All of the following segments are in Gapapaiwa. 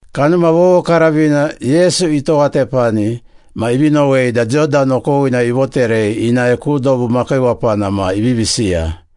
Kanuma Vovokaravina, Yesu itowatepani ma ivi nowei da Jodan okowina ivoterei inae ku dobu makiiwapana ma ivivi siya,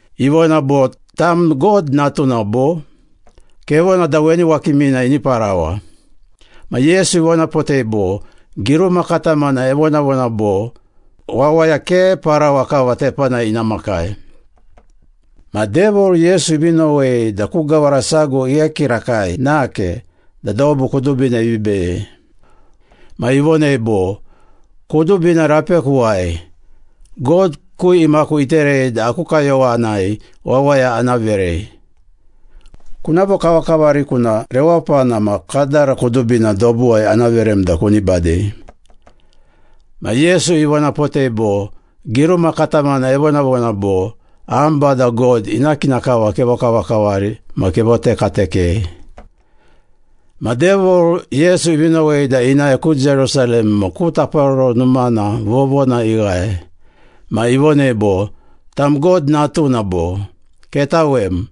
Ivona bo, “Tam God Natuna, bo? Kevona da weni wakimina ini parawa.” Ma Yesu ivonapotei bo, “Giruma katamana evonavona bo, ‘Wawaya ke parawa kava tepanai ina makai.’” Ma Devil, Yesu ivi nowei da ku gawara sago ighe kirakai nake da dobu kudubina ivi beyei, ma ivonei bo, “Kudubina rapekuwai. God ku imaku iterei da aku kayowanai wawaya ana verei. Kuna vokavakavariku na rewapana ma kadara kudubina dobuwai ana verem da kuni badei.” Ma Yesu ivonapotei bo, “Giruma katamana evonavona bo, ‘Am Bada God ina kina kava kevokavakavari ma kevotekatekei.’” Ma Devil, Yesu ivi nowei da inae ku Jerusalem ma ku Taparoro Numana vovona ighae. Ma ivonei bo, “Tam God Natuna, bo? Ketawem,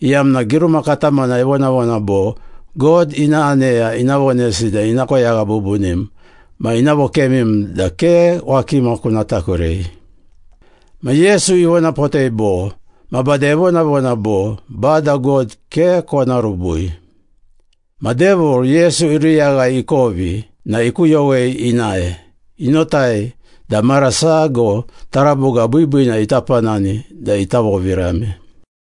iyamna giruma katamana evonavona bo, ‘God ina aneya ina vonesi da ina koyagha bubunim ma ina vokemim da ke wakima kuna takurei.’” Ma Yesu ivonapotei bo, “Ma bade evonavona bo, ‘Bada God ke kona rubui.’” Ma Devil, Yesu iruyaghai ikovi na ikuyowei inae. Inotai da mara sago taraboga biibiina ita panani da ita vovirame.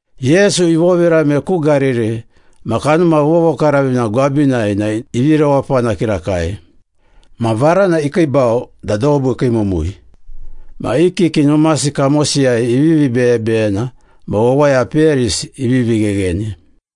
Yesu ivovirame ku Gariri ma Kanuma Vovokaravina gwabinai na ivi rewapana kirakai. Ma varana ikiibau da dobu ikiimumui. Ma i kiki numasi kamosiyai ivivi beyebeyena ma wawaya peyarisi ivivi ghegheni.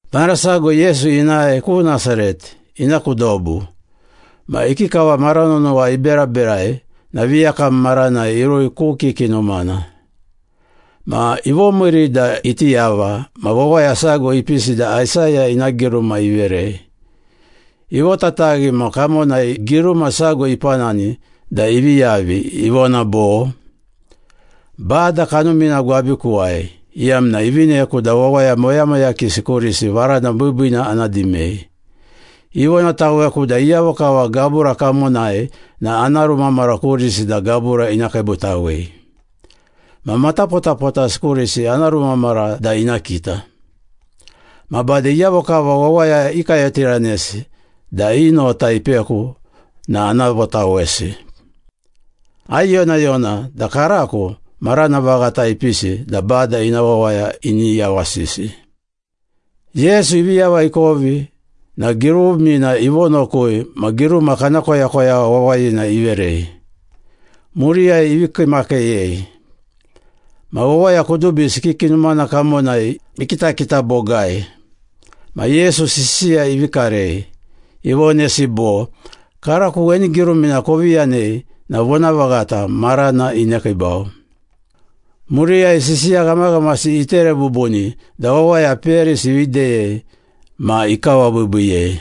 Mara sago Yesu inae ku Nasaret, ina ku dobu. Ma ikikava mara nonowa iberaberai na viyakam maranai irui ku kiki numana. Ma ivomiiri da iti yava ma wawaya sago ipisi da Aisaya ina giruma iverei. Ivotataghi ma kamonai giruma sago ipanani da ivi yavi, ivona bo, “Bada kanumina gwabikuwai, Iyamna ivineku da wawaya moyamoyakisi kurisi varana biibiina ana dimei. Ivonataweku da iyavo kava gabura kamonai na ana rumamara kurisi da gabura ina kiibutawei. Ma matapotapotasi kurisi ana rumamara da ina kita. Ma bade iyavo kava wawaya ikayotiranesi da i nota ipeku na ana votawesi. Aiyonayona da karako marana vaghata ipisi da Bada ina wawaya ini yawasisi.” Yesu ivi yava ikovi na girumina ivonokui ma giruma kana koyakoyagha wawayina iverei. Muriyai ivi kiimakiiyei. Ma wawaya kudubisi kiki numana kamonai ikitakita bogai ma Yesu sisiya ivi karei. Ivonesi bo, “Karako weni girumina kovi yanei na vonavaghata, marana inekiibau.” Muriyai sisiya ghamaghamasi itere bubuni da wawaya peyarisi ivi deyei ma ikawabiibiiyei.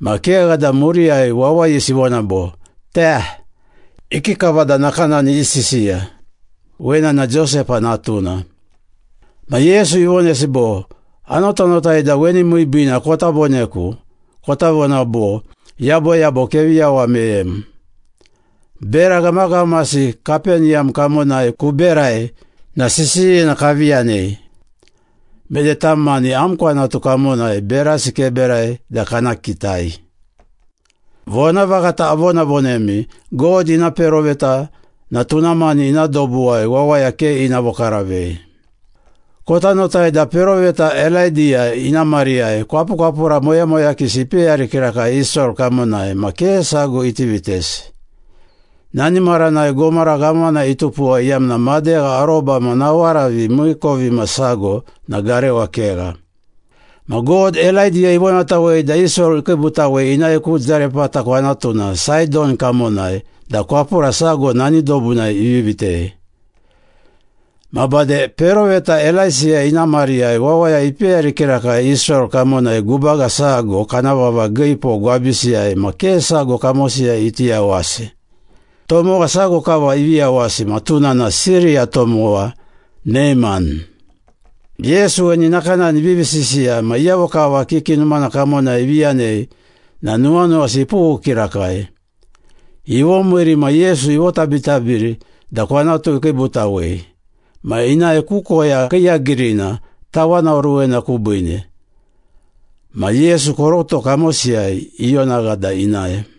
Ma kegha da, muriyai wawayisi ivona bo, “Te! Ikikava da nakanani isisiya? Wena na Josepa natuna.” Ma Yesu ivonesi bo, “Anotanotai da weni miibiina kota voneku, kota vona bo, ‘Yaboyabo kevi yawa meyem. Bera ghamaghamasi Kapeniyam kamonai kuberai na sisiyina kavi yanei. Mede tam mani am kwanatu kamonai berasi keberai da kana kitai.’ Vonavaghata avonavonemi, God ina peroveta na tuna mani ina dobuwai wawaya ke ina vokaravei. Kota notai da peroveta Elaidiya ina mariyai kwapukwapura moyamoyakisi ipeyari kirakai Israel kamonai ma ke sago iti vitesi. Nani maranai gomara ghamana itupuwa iyamna madegha aroba ma nawaravi miikovimasago na garewa kegha. Ma God, Elaidiya ivonatawei da Israel ikiibutawei inae ku Zarepata kwanatuna Saidon kamonai da kwapura sago nani dobunai ivi vitei. Ma bade peroveta Elaisiya ina mariyai wawaya ipeyari kirakai Israel kamonai gubaga sago kana vava giipo gwabisiyai ma ke sago kamosiyai iti yawasi. Tomowa sago kava ivi yawasi ma tuna na Siriya tomowa Neiman.” Yesu weni nakanani ivivi sisiya ma iyavo kava kiki numana kamonai ivi yanei na nuwanuwasi ipughu kirakai. Ivomiiri ma Yesu ivotabitabiri da kwanatu ikiibutawei. Ma inae ku koya kiiyagirina tawanoruwena kubiine. Ma Yesu koroto kamosiyai ionagha da inae.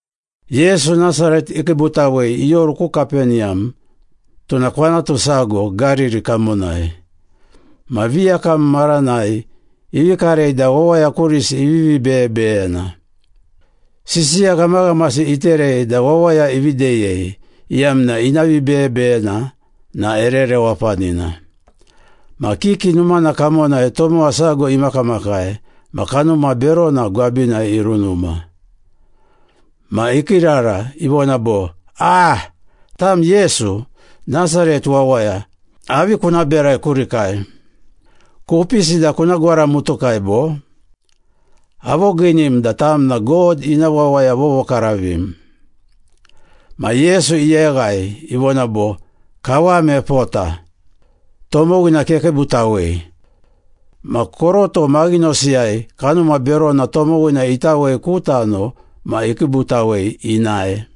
Yesu Nasaret ikiibutawei ioru ku Kapeniyam, tuna kwanatu sago Gariri kamonai. Ma viyakam maranai ivi karei da wawaya kurisi ivivi beyebeyena. Sisiya ghamaghamasi iterei da wawaya ivi deyei, iyamna ina vibeyebeyena na ere rewapanina. Ma kiki numana kamonai tomowa sago imakamakai, ma kanuma berona gwabinai irunuma. Ma ikiirara, ivona bo, “Aaa! Tam Yesu, Nasaret wawaya, avi kuna berai kurikai? Kupisi da kuna gwaramutukai, bo? Avogiinim da tam na God ina Wawaya Vovokaravim.” Ma Yesu iyeghai, ivona bo, “Kawam epota! Tomowina kekiibutawei!” Ma koroto maghinosiyai kanuma berona tomowina itawei ku tano ma ikiibutawei inae.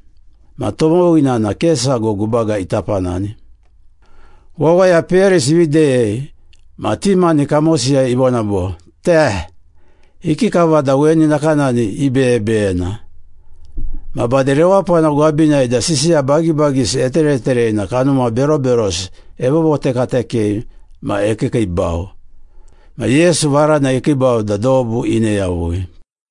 Ma tomowina na ke sago gubaga ita panani. Wawaya peyarisi ivi deyei ma ti mani kamosiyai ivona bo, “Te! Ikikava da weni nakanani ibeyebeyena? Ma bade rewapana gwabinai da sisiya bagibagisi etereterei na kanuma beroberosi evovotekatekei ma ekiikiibau.” Ma Yesu varana ikiibau da dobu ine yavui.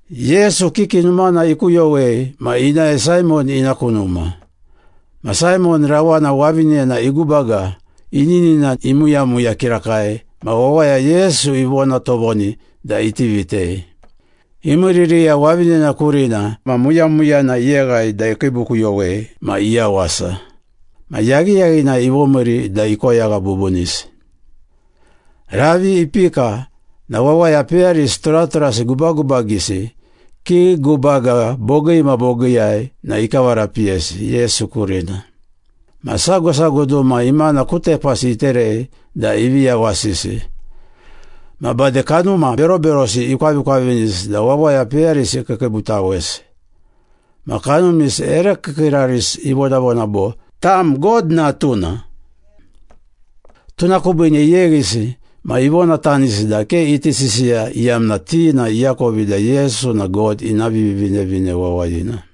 Yesu kiki numana ikuyowei ma inae Saimon ina ku numa. Ma Saimon rawana wavinena igubaga, ininina imuyamuya kirakai ma wawaya Yesu ivona tovoni da iti vitei. Imiiririya wavinena kurina ma muyamuyana iyeghai da ikiibukuyowei ma iyawasa. Ma yaghiyaghinai ivomiiri da ikoyagha bubunisi. Ravi ipika na wawaya peyarisi turaturasi gubagubagisi, kii gubaga bogii ma bogiiyai na ikavarapiyesi Yesu kurina. Ma sago sago duma imana ku tepasi iterei da ivi yawasisi. Ma bade, kanuma beroberosi ikwavikwavinisi da wawaya peyarisi ikiikiibutawesi. Ma kanumisi ere kiikiirarisi ivonavona bo, “Tam God Natuna!” Tuna kubiine iyeghisi ma ivonatanisi da ke iti sisiya, iyamna ti na iakovi da Yesu na God ina Vivinevine Wawayina.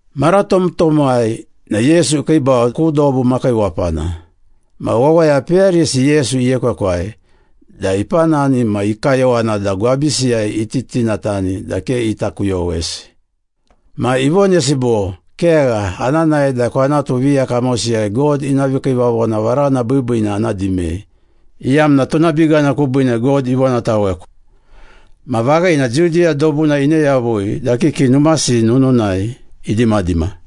Mara tomtomwai na Yesu ikiibau ku dobu makiiwapana. Ma wawaya peyarisi Yesu iekwekwai da ipanani ma i kayowana da gwabisiyai iti tinatani da ke ita kuyowesi. Ma ivonesi bo, “Kegha, ana nae da kwanatu viya kamosiyai God ina vikiivavona varana biibiina ana dimei, iyamna tuna bigana kubiine God ivonataweku.” Ma vaghina, Judiya dobuna ine yavui da kiki numasi nununai idimadima.